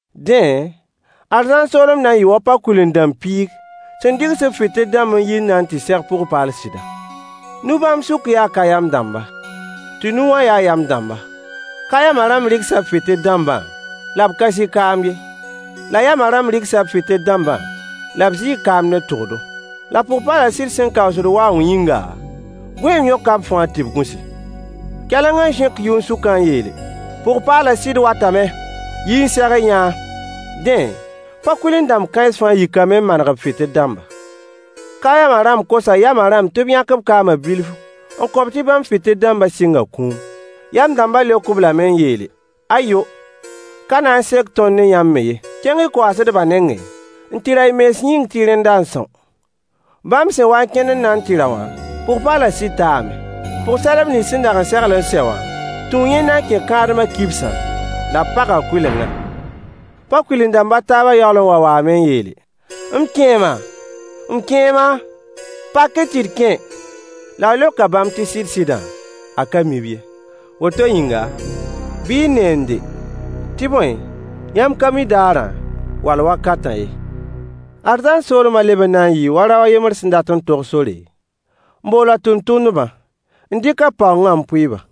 Dẽ, arzãn soolem na n yɩɩ wa pa-kuil-n-dãmb piig sẽn dɩgs b fɩtɩl dãmb n yi n na n tɩ seg pʋg-paal sɩda. Nu bãmb sʋkã yaa ka-yam dãmba, tɩ nu wã ya yam dãmba. Ka-yamã rãmb rɩgsa b fɩtɩl dãmbã, la b ka zɩ kaam ye. La yamã rãmb rɩgsa b fɩtɩl dãmbã, la b zɩ kaam ne tʋgdo. La pʋg-paalã sɩd sẽn kaoos waoong yĩnga, gõeem yõka b fãa tɩ b gũsi. Kɛleng n zẽk yʋn-sʋkã n yeele: Pʋg-paalã sɩd watame! Yi-y n seg-y-yã-a. Dẽ, pa-kuil-n-dãmb kãens fãa yikame n maneg b fɩtɩl dãmba. Ka-yamã rãmb kosa yamã rãmb tɩ b yãk b kaamã bilf n kõ-b tɩ bãmb fɩtɩl dãmbã sɩnga kũum. Yam dãmbã leok-b lame n yeele: Ayo! Ka na n sek tõnd ne yãmb me ye. Kẽng-y ka-koaasdbã nengẽ n tɩ ra y mens yĩng tɩ rẽnda n são. Bãmb sẽn wa n kẽnd n na n tɩ ra wã, pʋg-paalã sɩd taame. Pʋg-sadb nins sẽn dag n segl n sɛ wã tũu yẽnda n kẽ kãadmã kibsã, la b paga kʋɩlengã. Pa-kuil-n-dãmb a taabã yaool n wa waame n yeele: M kẽema! M kẽema! Pak-y tɩ d kẽ! La a leoka bãmb tɩ sɩd-sɩdã, a ka mi-b ye. Woto yĩnga, bɩ y neende, tɩ bõe, yãmb ka mi daarã, wall wakatã ye. Arzãn soolmã leb n na n yɩɩ wa rao a yembr sẽn dat n tog sore, n bool a tʋmtʋmdbã, n dɩk a paoongã n pʋɩ-ba.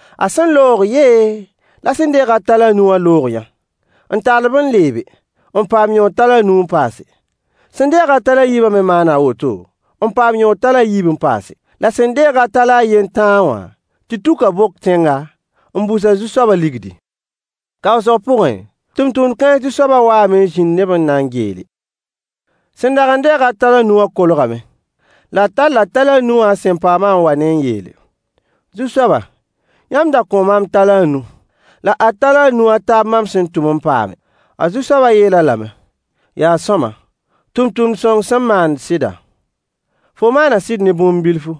A sẽn loog yee, la sẽn deeg-a talã a nu wã loog-yã, n tall-b n leebe, n paam yõod talã a nu n paase. Sẽn deeg-a talã a yiibã me maana a woto, n paam yõod talã a yiib n paase. La sẽn deeg-a talã a yen tãa wã tɩ tuka bok tẽnga, n bus a zu-soabã ligdi. Kaoosg pʋgẽ, tʋmtʋmd-kãens zu-soabã waame n zĩnd ne-b n na n geele. Sẽn dag n deeg-a talã a nu wã kolgame, la a talla talã a nu wã a sẽn paamã n wa-ne n yeele: Zu-soaba, yãmb da kõo maam talã a nu. La ad talã a nu a taab mam sẽn tʋm n paame. A zu-soabã yeel-a lame: Yaa sõama, tʋmtʋmd sõng sẽn maand sɩda! Fo maana sɩd ne bũmb bilfu,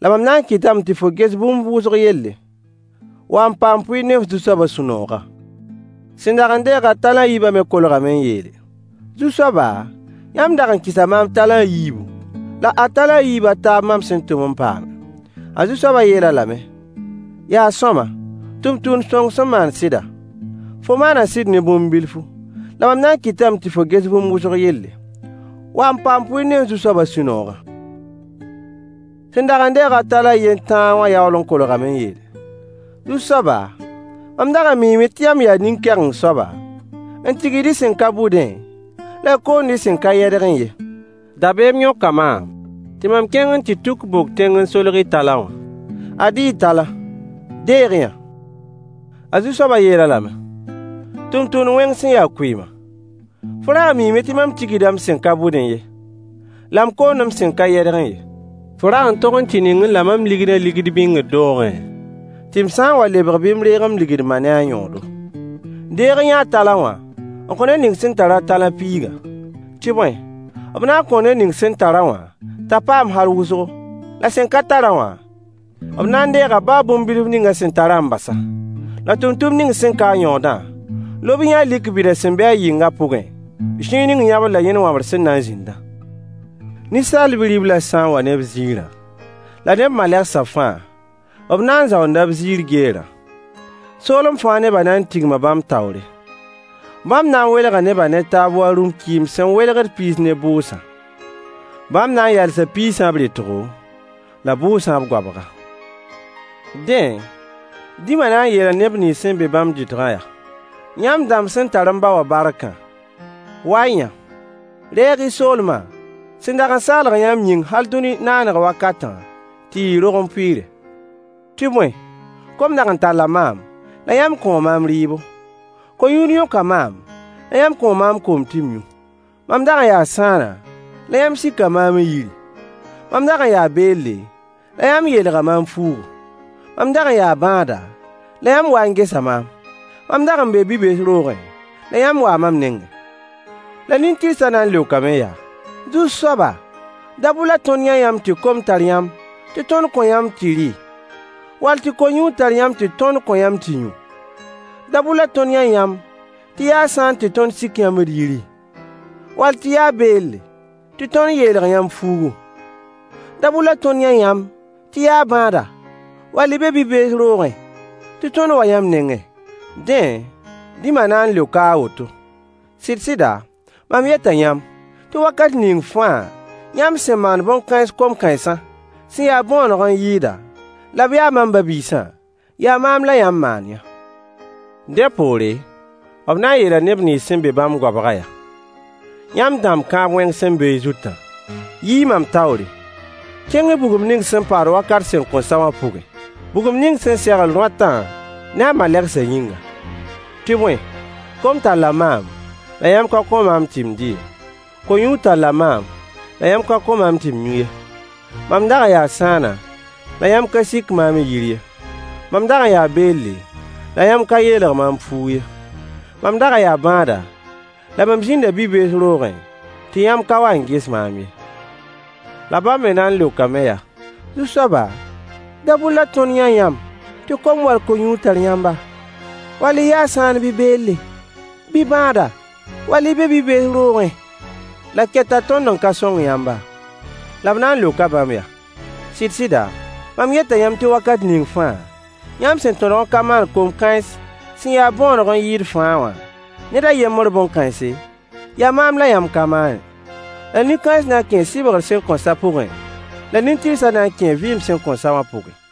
la mam na n kɩtame tɩ fo ges bũmb wʋsg yelle. Wa n paam pʋɩɩr ne f zu-soabã sũ-noogã. Sẽn dag n deeg-a talã a yiibã me kolgame n yeele: Zu-soaba, yãmb dag n kɩsa maam talã a yiibu, la ad talã a yiib a taab mam sẽn tʋm n paame. A zu-soabã yeel-a lame: Yaa sõama, tʋmtʋmd sõng sẽn maand sɩda! Fo maana sɩd ne bũmb bilfu, la mam na n kɩtame tɩ fo ges bũmb wʋsg yelle. Wa n paam pʋɩɩr ne f zu-soabã sũ-noogã. Sẽn dag n deeg-a talã a yen tãa wã yaool n kolgame n yeele: Zu-soaba, mam dag n miime tɩ yãmb yaa nen-kɛgeng soaba, n tigsd y sẽn ka bʋdẽ, la y koond y sẽn ka yɛdgẽ ye. Dabeem yõka maam tɩ mam kẽng n tuk bok tẽng n solg y talã wã. Ad-y y talã! Deeg-y-yã. A zu-soabã yeel-a lame: tʋmtʋmd-wẽng sẽn ya kʋɩɩma, fo rag n miime tɩ mam tigsda m sẽn ka bʋdẽ ye, la m koond m sẽn ka yɛdgẽ ye. Fo rag n tog n tɩ ningẽ la mam ligdã bãnkẽ, tɩ m sã n wa lebg bɩ m reeg m ligd-ma ne a yõodo. Deeg-y-yã a talã wã n kõ ned ning sẽn tar-a talã piigã. Tɩ bõe, b na n kõo ned ning sẽn tar-a wã t'a paam hal wʋsgo, la sẽn ka tar-a wã, b na n deega baa bũmb bilf ning a sẽn tarã n bas-a. La tʋmtʋmd ning sẽn ka-a yõodã, lob-y-yã-a lik bida sẽn be-a yɩngã pʋgẽ, zĩig ning yãbr la yẽn wãbr sẽn na n zĩndã. Ninsaal Bi-riblã sã n wa ne b ziirã, la ne b malegsã fãa, b na n zaoonda b ziir geerã. Soolem fãa nebã na n tigma bãmb taoore. Bãmb na n welga nebã ne taab wa rũm-kɩɩm sẽn welgd piis ne bʋʋsã. Bãmb na n yalsa piisã b rɩtgo, la bʋʋsã b goabga. Dẽ, Rĩmã na n yeela neb nins sẽn be bãmb dɩtgã yaa: Yãmb dãmb sẽn tar m ba wã barkã, wa-y-yã! Reeg-y soolmã sẽn dag n segl yãmb yĩng hal dũni naaneg wakatã tɩ yɩ y rogem pʋɩɩre. Tɩ bõe, kom dag n talla maam, la yãmb kõo maam rɩɩbo. Ko-yũud yõka maam, la yãmb kõo maam koom tɩ m yũ. Mam dag n yaa sãana, la yãmb sika maam y yiri. Mam dag n yaa beelle, la yãmb yeelga maam fuugu. Mam dag n yaa bãada, la yãmb waa n gesa maam. Mam dag n bee bi-bees roogẽ, la yãmb waa mam nengẽ. La nin-tɩrsã na n leokame yaa: Zu-soaba, dabʋr la tõnd yã yãmb tɩ kom tar yãmb tɩ tõnd kõ yãmb tɩ y rɩ, wall tɩ ko-yũud tar yãmb tɩ tõnd kõ yãmb tɩ y yũ? Dabʋr la tõnd yã yãmb tɩ y ya sãan tɩ tõnd sik yãmb d yiri, wall tɩ y ya beel tɩ tõnd yeelg yãmb fuugu? Dabʋr la tõnd yã yãmb tɩ y ya bãada, wall y be bi-bees roogẽ tɩ tõnd wa yãmb nengẽ? Dẽ, Rĩma na n leoka a woto: Sɩd-sɩda, mam yeta yãmb tɩ wakat ning fãa yãmb sẽn maan bõn-kãens kom-kãensã sẽn ya bõoneg n yɩɩda, la b ya mam ba-biisã, yaa maam la yãmb maan-yã. Dẽ poore, b na n yeela neb nins sẽn be-b bãmb goabgã yaa: Yãmb dãmb kãab-wẽng sẽn be y zutã, yi-y mam taoore! Kẽng-y bugum sẽn paad wakat sẽn kõn sa wã pʋgẽ, bugum ning sẽn segl rõatã ne a malegsã yĩngã. Tɩ bõe, kom talla maam, la yãmb ka kõ maam tɩ m dɩ ye. Ko-yũud talla maam, la yãmb ka kõ maam tɩ m yũ ye. Mam dag n yaa sãana, la yãmb ka sik maam y yir ye. Mam dag n yaa beelle, la yãmb ka yeelg maam fuug ye. Mam dag n yaa bãada, la mam zĩnda bi-bees roogẽ tɩ yãmb ka wa n ges maam ye. La bãmb me na n leokame yaa: Zu-soaba, dabʋr la tõnd yã yãmb tɩ kom wall ko-yũud tar yãmba, wall y ya sãan bɩ beelle, bɩ bãada, wall y be bi-bees roogẽ la keta tõnd n ka sõng yãmba? La b na n leoka bãmb yaa: Sɩd-sɩda, mam yeta yãmb tɩ wakat ning fãa yãmb sẽn tõdg n ka maan kom-kãens sẽn ya bõoneg n yɩɩd fãa wã ned a yembr bõn-kãense, yaa maam la yãmb ka maane. La nin-kãens na n kẽe sɩbgr sẽn kõn sa pʋgẽ, la nin-tɩrsã na n kẽe vɩɩm sẽn kõn sa wã pʋgẽ.